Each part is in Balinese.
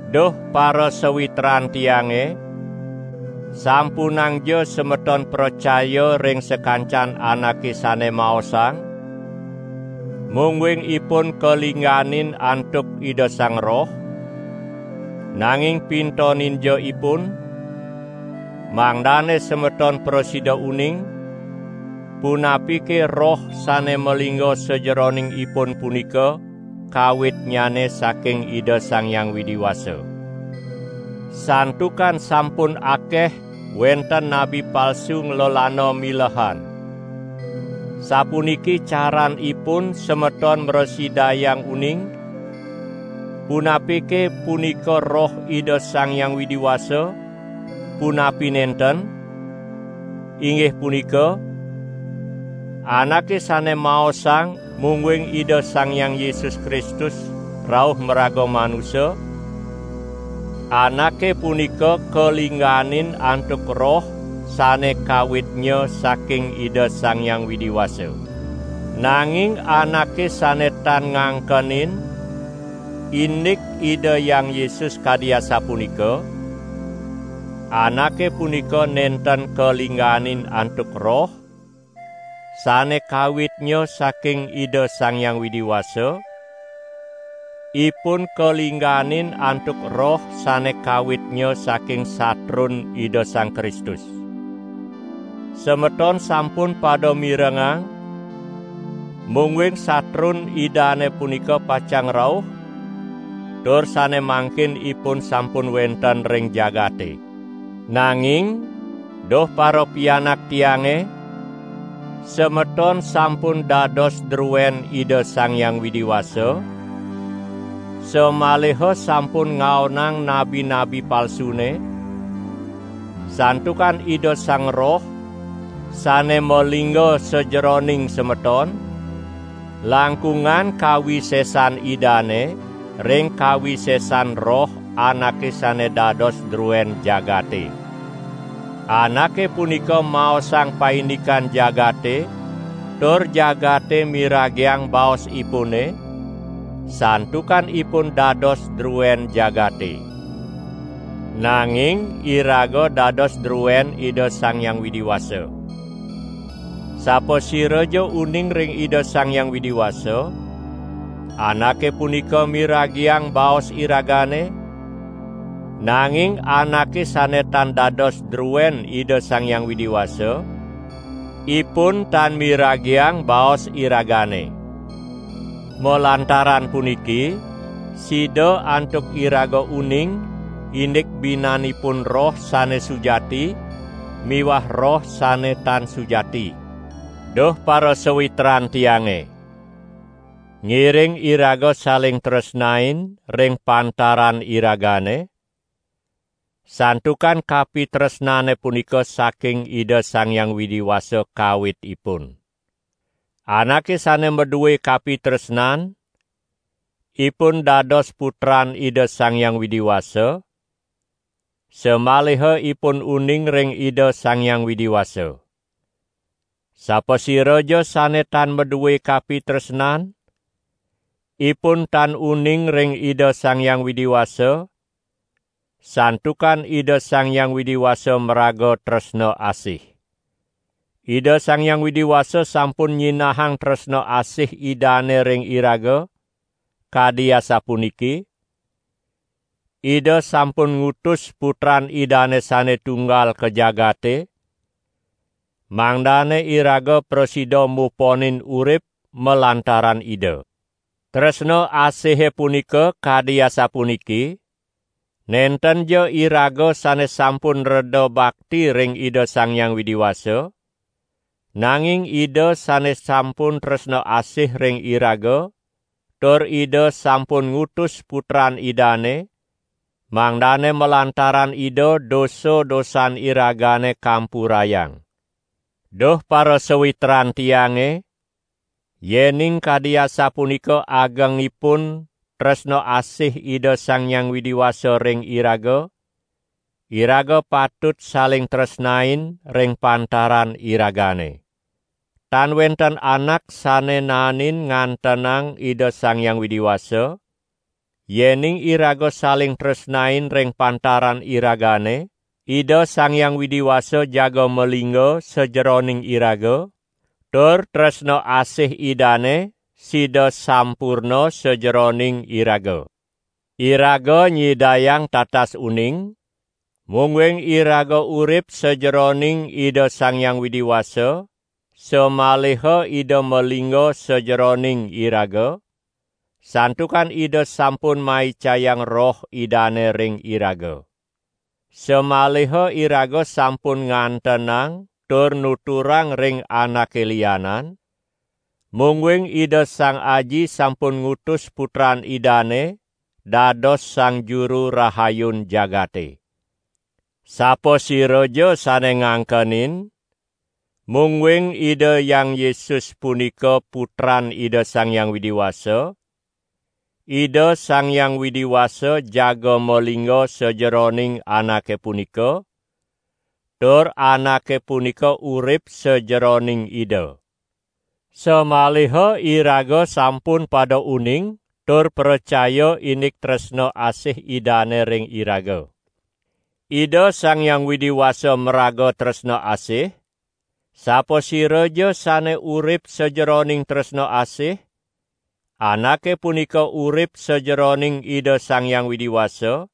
Duh parasawitran tiange: sampunangja semeton pracaya ring sakancan anake sane maosang, mungguing ipun kalingganin antuk Ida Sang Roh, nanging pintoninja ipun, mangdane semeton prasida uning, punapike roh sane malingga sajeroning ipun punika kawitnyane saking Ida Sang Hyang Widi Wasa. Santukan sampun akeh wenten nabi palsu nglelana milehan. Sapuniki caranipun semeton mrasidayang uning, punapike punika Roh Ida Sang Hyang Widi Wasa punapi nenten, inggih punika: anake sane maosang, mungguing Ida Sang Hyang Yesus Kristus rauh maraga manusa, anake punika kalingganin antuk Roh sane kawitnya saking Ida Sang Hyang Widi Wasa. Nanging anake sane tan ngangkenin, indik Ida Hyang Yesus kadi asapunika, anake punika nenten kalingganin antuk Roh, sane kawitnya saking Ida Sang Hyang Widi Wasa, ipun kalingganin antuk roh sane kawitnya saking satrun Ida Sang Kristus. Semeton sampun pada mirengang, mungguing satrun Idane punika pacang rauh tur sane mangkin ipun sampun wenten ring jagate. Nanging, duh parapianak tiange, semeton sampun dados druen Ida Sang Hyang Widi Wasa, samaliha sampun ngaonang nabi-nabi palsune; santukan Ida Sang Roh, sane malingga sajeroning semeton, langkungan kawisesan Idane ring kawisesan roh anake sane dados druen jagate. Anake punika maosang paindikan jagate tur jagate miragiang baosipune, santukan ipun dados druen jagate. Nanging iraga dados druen Ida Sang Hyang Widi Wasa. Sapasiraja uning ring Ida Sang Hyang Widi Wasa, anake punika miragiang baos iragane; nanging anake sane tan dados druen Ida Sang Hyang Widi Wasa, ipun tan miragiang baos iragane. Malantaran puniki sida antuk iraga uning indik binanipun Roh sane sujati miwah roh sane tan sujati. Duh parasawitran tiange! Ngiring iraga saling tresnain ring pantaran iragane, santukan kapitresnane punika saking Ida Sang Hyang Widi Wasa kawitipun. Anake sane madue kapitresnan, ipun dados putran Ida Sang Hyang Widi Wasa, samaliha ipun uning ring Ida Sang Hyang Widi Wasa. Sapasiraja sane tan madue kapitresnan, ipun tan uning ring Ida Sang Hyang Widi Wasa, santukan Ida Sang Hyang Widi Wasa maraga tresna asih. Ida Sang Hyang Widi Wasa sampun nyinahang tresna asih Idane ring iraga, kadi asapuniki: Ida sampun ngutus Putran Idane sane Tunggal ka jagate, mangdane iraga prasida muponin urip malantaran Ida. Tresna asihe punika kadi asapuniki: nentenja iraga sane sampun dreda bakti ring Ida Sang Hyang Widi Wasa, nanging Ida sane sampun tresna asih ring iraga tur Ida sampun ngutus Putran Idane, mangdane malantaran Ida dosa-dosan iragane kampurayang. Duh parasawitran tiange, yening kadi asapunika agengipun tresna asih Ida Sang Hyang Widi Wasa ring iraga, iraga patut saling tresnain ring pantaran iragane. Tan wenten anak sane naenin ngantenang Ida Sang Hyang Widi Wasa; yening iraga saling tresnain ring pantaran iragane, Ida Sang Hyang Widi Wasa jaga malingga sajeroning iraga, tur tresna asih Idane sida sampurna sajeroning iraga. Iraga nyidayang tatas uning, mungguing iraga urip sajeroning Ida Sang Hyang Widi Wasa samaliha Ida malingga sajeroning iraga, santukan Ida sampun maicayang Roh Idane ring iraga. Samaliha iraga sampun ngantenang tur nuturang ring anake lianan, mungguing Ida Sang Aji sampun ngutus Putran Idane dados Sang Juru Rahayun jagate. Sapasiraja sane ngangkenin, mungguing Ida Hyang Yesus punika Putran Ida Sang Hyang Widi Wasa, Ida Sang Hyang Widi Wasa jaga malingga sajeroning anake punika, tur anake punika urip sajeroning Ida. Samaliha iraga sampun pada uning tur pracaya indik tresna asih Idane ring iraga. Ida Sang Hyang Widi Wasa maraga tresna asih, sapasiraja sane urip sajeroning tresna asih, anake punika urip sajeroning Ida Sang Hyang Widi Wasa,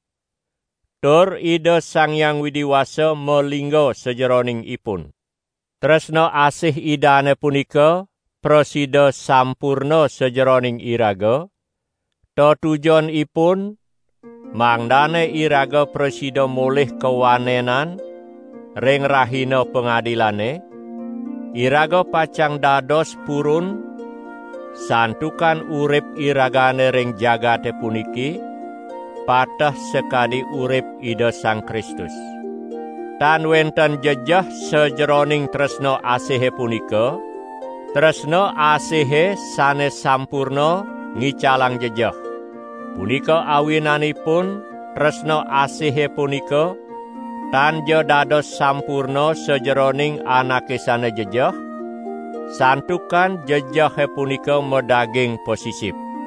tur Ida Sang Hyang Widi Wasa malingga sajeroning ipun. Tresna asih Idane punika prasida sampurna sajeroning iraga, tetujonipun mangdane iraga prasida molih kawanenan ring Rahina Pangadilane; iraga pacang dados purun, santukan urip iragane ring jagate puniki pateh sakadi urip Ida Sang Kristus. Tan wenten jejeh sajeroning tresna asihe punika, tresna asihe sane sampurna ngicalang jejeh. Punika awinanipun tresna asihe punika tanja dados sampurna sajeroning anake sane jejeh, santukan jejehe punika madaging pasisip.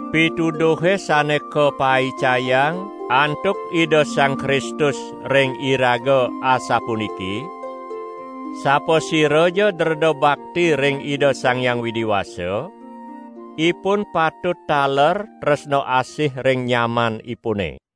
Pituduhe sane kapaicayang antuk Ida Sang Kristus ring iraga asapuniki: Sapasiraja dreda bakti ring Ida Sang Hyang Widi Wasa, ipun patut taler tresna asih ring nyamanipune.